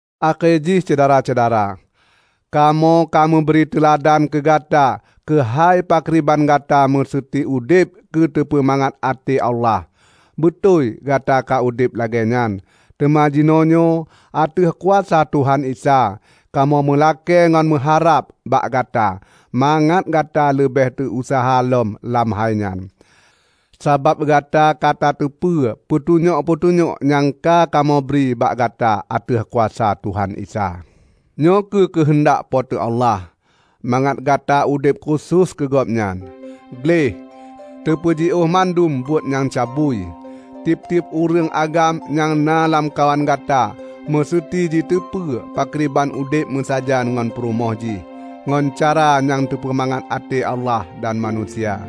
Akhé jih Syedara-syedara, kamoe kameubri teuladan keugata keuhai pakriban gata meuseuti udeb keu teupeumangat até Allah. Beutôi gata ka udeb lagée nyan. Teuma jinoenyoe ateueh kuasa Tuhan Isa, kamoe meulakée ngon meuharab bak gata mangat gata leubeh tauseuha lom lam hai nyan! Sabab gata ka tateupeue peutunyok-peutunyok nyang ka kamoe bri bak gata ateueh kuasa Tuhan Isa. Nyoe kheueh keuheundak Po teu Allah: Mangat gata udeb khusos keu Gobnyan, gleh, tapeujiôh mandum buet nyang cabui. Tieb-tieb ureuëng agam nyang na lamkawan gata meuseuti jiteupeue pakriban udeb meusajan ngon purumoh jih ngon cara nyang teupeumangat até Allah dan manusia.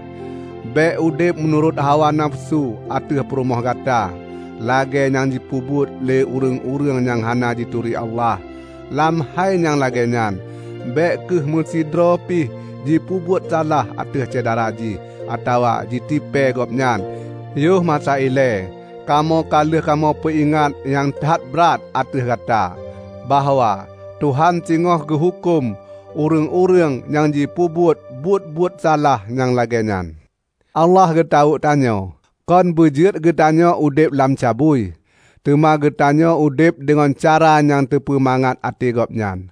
Bék udeb meunurot hawa nafeusu ateueh purumoh gata, lagée nyang jipeubuet lé ureuëng-ureuëng nyang hana jituri Allah. Lam hai nyang lagée nyan, bék kheueh meusidroe pi jipeubuet salah ateueh syedara jih, atawa jitipée gobnyan. Yoh masa ilée kamoe ka lheueh kamoe peuingat nyang that brat ateueh gata, bahwa Tuhan singoh geuhuköm ureuëng-ureuëng nyang jipeubuet buet-buet salah nyang lagée nyan. Allah geutawök tanyoe, kon beujeuet geutanyoe udeb lam cabui, teuma geutanyoe udeb deungon cara nyang teupeumangat até Gobnyan.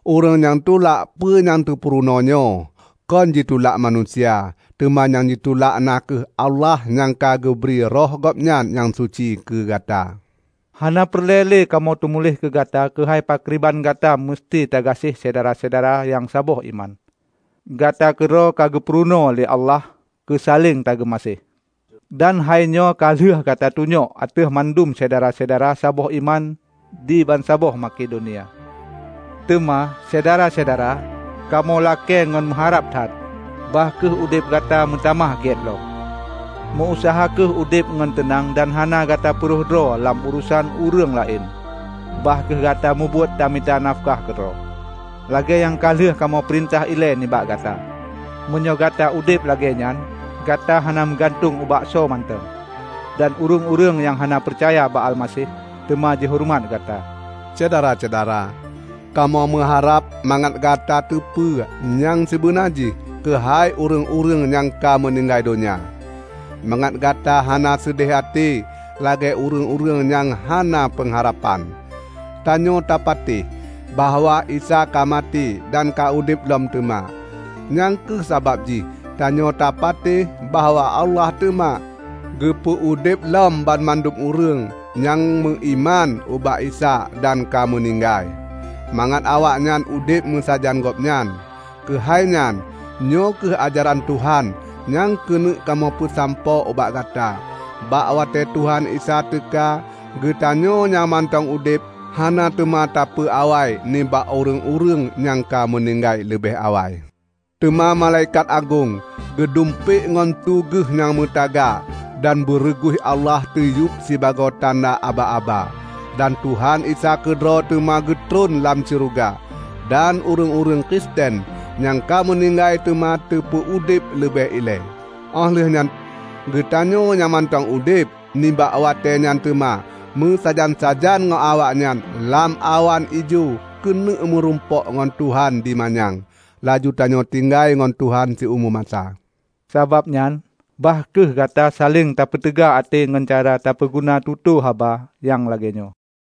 Ureuëng nyang tulak peue nyang teupurunoe nyoe, kon jitulak manusia, teuma nyang jitulak na kheueh Allah nyang ka geubri Roh Gobnyan nyang suci keugata. Hana peureulée lé kamoe teumuléh keu gata keuhai pakriban gata meuseuti tagaséh syedara-syedara nyang saboh iman. Gata keudroe ka geupurunoe lé Allah keusaleng tameugaséh. Dan hainyoe ka lheueh gata tunyok ateueh mandum syedara saboh iman di bansaboh Makedonia. Teuma, Syedara-syedara, kamoe lakée ngon meuharab that, bah kheueh udeb gata meutamah gét lom. Meu-useuha kheueh udeb ngon teunang dan hana gata peurhoh droe lam urosan ureuëng laén. Bah kheueh gata mubuet tamita nafeukah keudroe, lagée nyang ka lheueh kamoe peurintah ilée nibak gata. Meunyoe gata udeb lagée nyan, gata hana meugantueng ubak soe mantong, dan ureuëng-ureuëng nyang hana peucaya bak Almaseh, teuma jihoreumat gata. Syedara-syedara, kamoe meuharab mangat gata teupeu nyang sibeuna jih keuhai ureuëng-ureuëng nyang ka meuninggai donya; mangat gata hana seudeh até lagée ureuëng-ureuëng nyang hana peungharapan. Tanyoe tapatéh bahwa Isa ka maté dan ka udeb lom teuma. Nyang kheueh sabab jih tanyoe tapatéh bahwa Allah teuma geupeu udeb lom banmandum ureuëng nyang meuiman ubak Isa dan ka meuninggai, mangat awaknyan udeb meusajan gobnyan. Keuhai nyan, nyoe kheueh ajaran Tuhan nyang keuneuk kamoe peusampoe ubak gata: Bak watée Tuhan Isa teuka, geutanyoe nyang mantong udeb hana teuma tapeuawai nibak ureuëng-ureuëng nyang ka meuninggai leubeh awai. Teuma malaikat agong geudumpék ngon su geuh nyang meutaga dan beureuguih Allah teuyueb sibagoe tanda aba-aba. Dan Tuhan Isa keudroe teuma geutron lam syeuruga, dan ureuëng-ureuëng Kristen nyang ka meuninggai teuma teupeu udeb leubeh ilée. Óh lheueh nyan, geutanyoe nyang mantong udeb nibak watée nyan teuma meusajan-sajan ngon awaknyan lam awan ijo keuneuk meurumpok ngon Tuhan di manyang. Laju tanyoe tinggai ngon Tuhan siumu masa. Sabab nyan, bah kheueh gata saléng tapeuteuga até ngon cara tapeuguna tutoe haba nyang lagée nyoe.